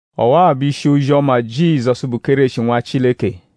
Ọwa-a bụ ishi ozi-ọma Jizọsu, bụ Kéreshi; Nwa Chileke.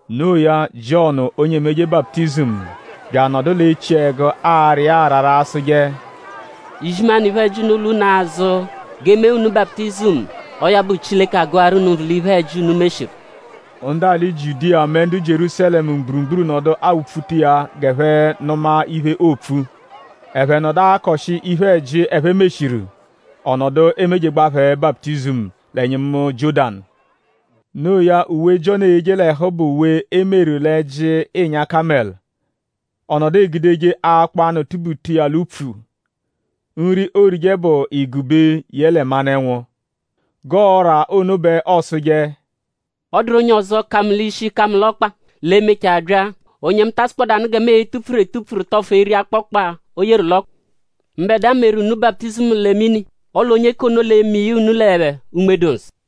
Noo ya Jiọnu onye emeje baputizimu bya anọdu l'echiẹgu ara iya arara asụje: “Izimanụ iphe-ẹji unu lwa unu azụ; g'e mee unu baputizimu. Ọo ya bụ Chileke agụaru unu nvụ l'iphe-ẹji, unu meshiru.” Ndu alị Jiudiya mẹ ndu Jierúsalẹmu mgburugburu nọdu awupfutaje iya g'ẹphe nụma iphe, oopfu. Ẹphe nọdu akọshi iphe-ẹji, ẹphe meshiru; ọ nọdu emejegbaa phẹ baputizimu l'ẹnyimu Jiọ́danu. Noo ya; uwe, Jiọnu eyeje l'ẹhu bụ uwe, e meru l'ẹ́jí ịnya-kamẹlu; ọ nọdu egudeje akpọ-anụ tubuta iya l'upfu. Nri, oorije bụ igube yẹle manụ-ẹnwu. G'ọora ọ́rà ono bẹ ọosuje: “Ọ dụru onye ọzo, ka mu l'ishi; ka mu l'ọkpa, l'e-mechaa bya; onye mu ta asụkpodanu gẹ mu e-tupfuru etupfuru; tọfu eri akpọkpa, o yeru l'ọkpa. Mbẹdua meru unu baputizimu lẹ mini; ọle onye k'ono l'e-me iya unu lẹ Unme-dụ-Nsọ.”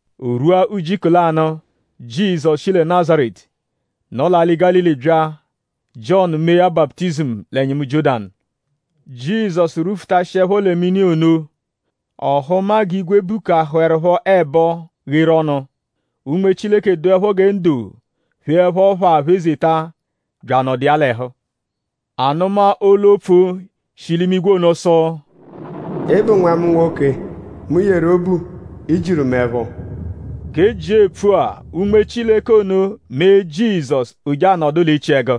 O rwua ujiku lanụ; Jizọsu shi lẹ Nazaretu, nọ l'alị Gálili bya; Jiọnu mee ya baputizimu l'ẹnyimu Jiọ́danu. Jizọsu rwufutashiẹpho lẹ mini ono; ọ hụma g'igwe bukahụerupho ẹbo gheru ọnu; Unme Chileke dụepho gẹ ndo pheẹpho phaa phezeta bya anọdu iya l'ẹhu. A nụma olu-opfu, shi l'imigwe ono sụ: “Ị bụ Nwa mu nwoke, mu yeru obu. I jiru mu ẹpho.” G'e jia epfua; Unme Chileke ono mee Jizọsu; o je anọdu l'echiẹgu.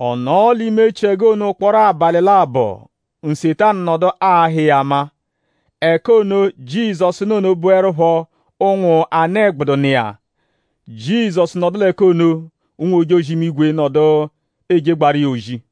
Ọ nọo l'ime echiẹgu ono ụkporo abalị labọ; Nsetanu nọdu ahụ iya ama. Ẹka ono, Jizọsu nọ ono bụerupho ụnwu anụ-ẹgbudu nọ iya. Jizọsu nọdu l'ẹka ono; ụnwu-ojozi-imigwe nọdu ejegbaaru iya ozi.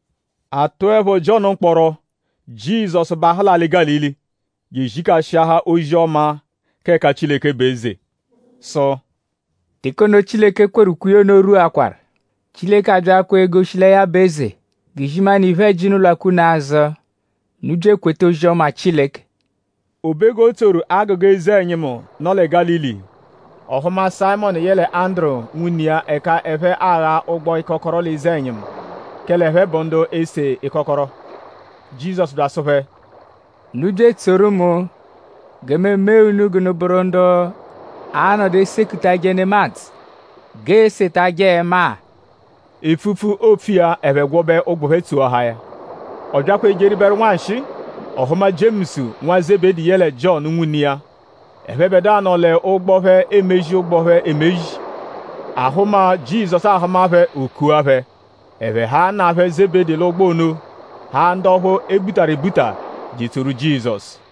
A tụepho Jiọnu mkpọro; Jizọsu bahụ l'alị Gálili; je ezikashiahaa ozi-ọma, k'ẹka Chileke bụ eze sụ: “Teke ono, Chileke kweru ukwe iya ono rwuakwaru. Chileke abyaakwaa egoshi lẹ ya bụ eze; g'izimanụ iphe-ẹji unu lwakwa unu azụ; unu bya ekweta ozi-ọma Chileke.” O be g'o tsoru agụga eze-ẹnyimu, nọ lẹ Gálili; ọ hụma Sayịmonu yẹle Anduru, nwune iya ẹka ẹphe agha ụgbu-ịkokoro l'eze-ẹnyimu; kẹle ẹphe bụ ndu ese ịkokoro. Jizọsu bya asụ phẹ: “Unu bya etsoru mu gẹ mu emee unu g'unu bụru ndu a-nọdu esekutajẹ nemadzụ g'eesetajẹ ẹma-a.” Epfupfu, oopfu iya; ẹphe gwọbe ụgbu phẹ; tsoahaa ya. Ọ byakwa ejeribẹru nwanshịi; ọ hụma Jiemusu nwa Zebedi yẹle Jiọnu nwune iya. Ẹphebedua nọ l'ụgbo phẹ emezi ụgbu phẹ emezi. Ahụma, Jizọsu ahụma phẹ; o kua phẹ. Ẹphe haa nna phẹ Zebedi l'ụgbo ono; haa ndu ọphu e butaru ebuta; je etsoru Jizọsu.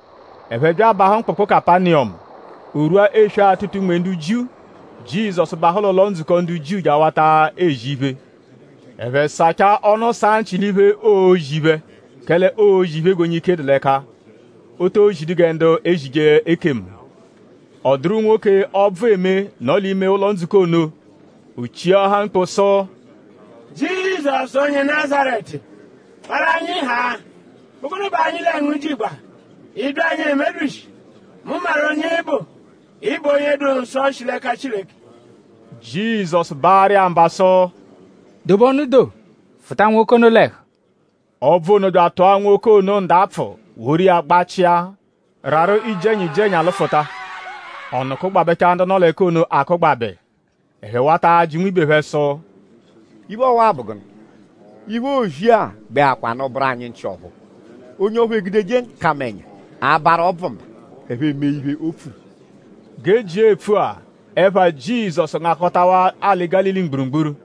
Ẹphe bya abahụ mkpụkpu Kapaniyọmu. O -rwuẹpho eswe-atụta-unme ndu Jiu; Jizọsu bahụ l'ụlo-ndzukọ ndu Jiu je awata ezi iphe. Ẹphe sachaa ọnu saa nchị l'iphe, oozi phẹ; kẹle oozi iphe g'onye ike dụ l'ẹka. O to zidu gẹ ndu ezije ekemu. Ọ dụru nwoke, ọbvu eme, nọ l'ime ụlo-ndzukọ ono. O chiahaa mkpu sụ: “Jizọsu onye Nazaretu; parụ anyi haa!?Bụ gụnu bẹ anyi lẹ ngu jigba??Ị bya anyi emebyishi? Mu maru onye ị bụ. Ị bụ onye dụ nsọ, shi l'ẹka Chileke!” Jizọsu baarụ iya mba sụ: “Dobe ọnu doo; fụta nwoke ono l'ẹhu.” Ọbvu ono bya atụa nwoke ono ndapfụ woru iya gbachia; rarụ iji-ẹnya iji-ẹnya lụfuta. Ọnu kụgbabechaa ndu nọ l'ẹka ono akụgbabe. Ẹphe wata ajị nwibe phẹ sụ: “?Iphe ọwa-a bụ gụnu? Iphe, oozi-a gbẹkwanu bụru anyi nchị ọ̀phúú. Onye ọphu egudeje nkamẹnya abarụ ọbvu mba; ẹphe eme iphe, o pfuru.” G'e jia epfua; ẹpha Jizọsu ngakọtawaa alị Gálili mgburugburu.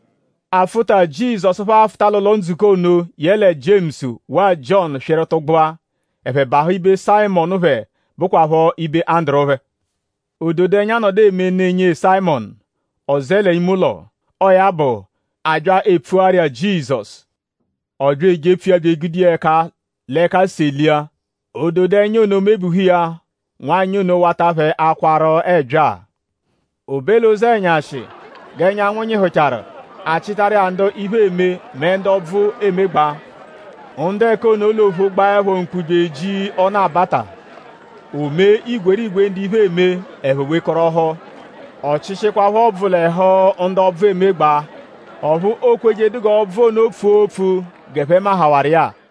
Afụta, Jizọsu phẹ afụta l'ụlo-ndzukọ ono yẹle Jiemusu; waa Jiọnu swịru tụgbua. Ẹphe bahụ ibe Sayịmonu phẹ, bụkwapho ibe Anduru phẹ. Ododẹnya nọdu eme ne nyee Sayịmonu; ọ zẹe l'ime ụlo. Ọo ya bụ; a bya epfuaru iya Jizọsu. Ọ bya ejepfu iya bya egude iya ẹka l'ẹka selia; ododẹnya ono mebuhu iya; nwanyị ono wata phẹ akwaru ẹbyaa. O be l'ụzenyashi; g'ẹnyanwu nyịhuchaaru; a chịtaru iya ndu iphe eme mẹ ndu ọbvu emegbaa. Ndu ẹka ono l'ophu gbaẹpho mkpu bya eji ọnu-abata. O mee igwerigwe ndu iphe eme; ẹphe wekọrohu. Ọ chịshikwapho ọbvu l'ẹhu ndu ọbvu emegbaa. Ọphu o kwejedu g'ọbvu ono pfua opfu g'ẹphe mahawarụ iya-a.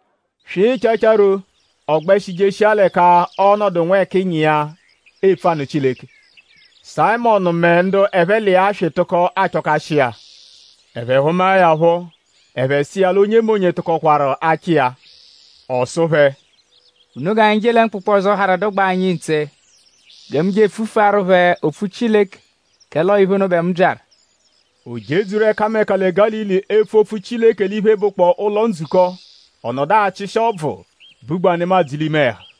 Swịchechero; ọ gbẹshi jeshia l'ẹka ọo-nọdu nwẹkinyi iya; epfu anụ Chileke. Sayịmonu mẹ ndu ẹphe l'iya swị tụko achọkashi iya. Ẹphe hụmae ya phọ; ẹphe sụ iya l'onyemonye tụkokwaru achọ iya. Ọ sụ phẹ: “Unu g'anyi je lẹ mkpụkpu ọzo, harụ dụgbaa anyi ntse gẹ mu je epfufuaru phẹ opfu Chileke; kẹle ọo iphe ono bẹ mu byaru.” O jedzuru ẹkameka lẹ Gálili epfu opfu Chileke l'iphe, bụkpoo ụlo-ndzukọ. Ọ nọdu achịshi ọbvu, bugbaa nemadzụ l'ime ẹhu.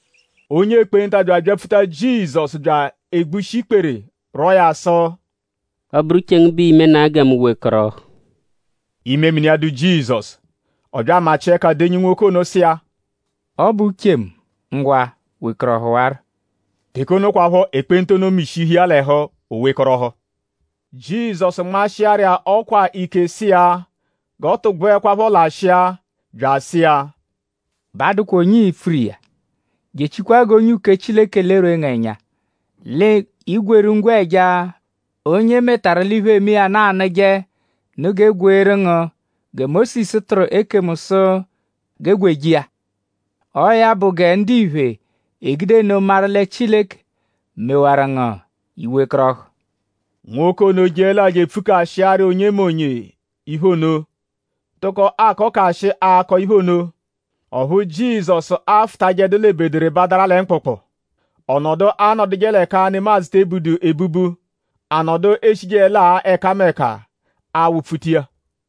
Onye ekpenta bya abyapfuta Jizọsu bya egbushi ikpere; rwọo ya sụ: “Ọ -bụru uche ngu bẹ ii-menaa gẹ mu wekọrohu.” Imemini iya dụ Jizọsu; ọ bya amachịa ẹka denyi nwoke ono; sụ iya: “Ọ bụ uche mu. Ngwa; wekọrohuwaro!” Teke ono kwaphọ; ekpenta ono mishihu iya l'ẹhu; o wekọrohu. Jizọsu nmashịaru iya ọkwa ike sụ iya g'ọ tụgbuekwapho lashịa; bya asụ iya: “Ba adụkwa onye ii-pfuru iya; jechikwaa g'onye uke Chileke lerwee ngu ẹnya. L'i gwerụ ngwẹja, onye e metaru l'iphe, eme iya nụ anụje nụ g'e gweeru ngu gẹ Mósisu tụru ekemu sụ g'e gweje iya. Ọo ya bụ gẹ ndiphe e-gude nno maru lẹ Chileke mewaru ngu; i wekọrohu.” Nwoke ono jeẹlaa je epfukashiaharu onyemonye iphe ono; tụko akọkashi akọ iphe ono; ọphu Jizọsu afụtajeedu l'ebederebadara lẹ mkpụkpu. Ọ nọdu anọduje l'ẹka nemadzụ te ebudu ebubu. A nọdu eshijeẹlaa ẹkameka awụ-pfuta iya.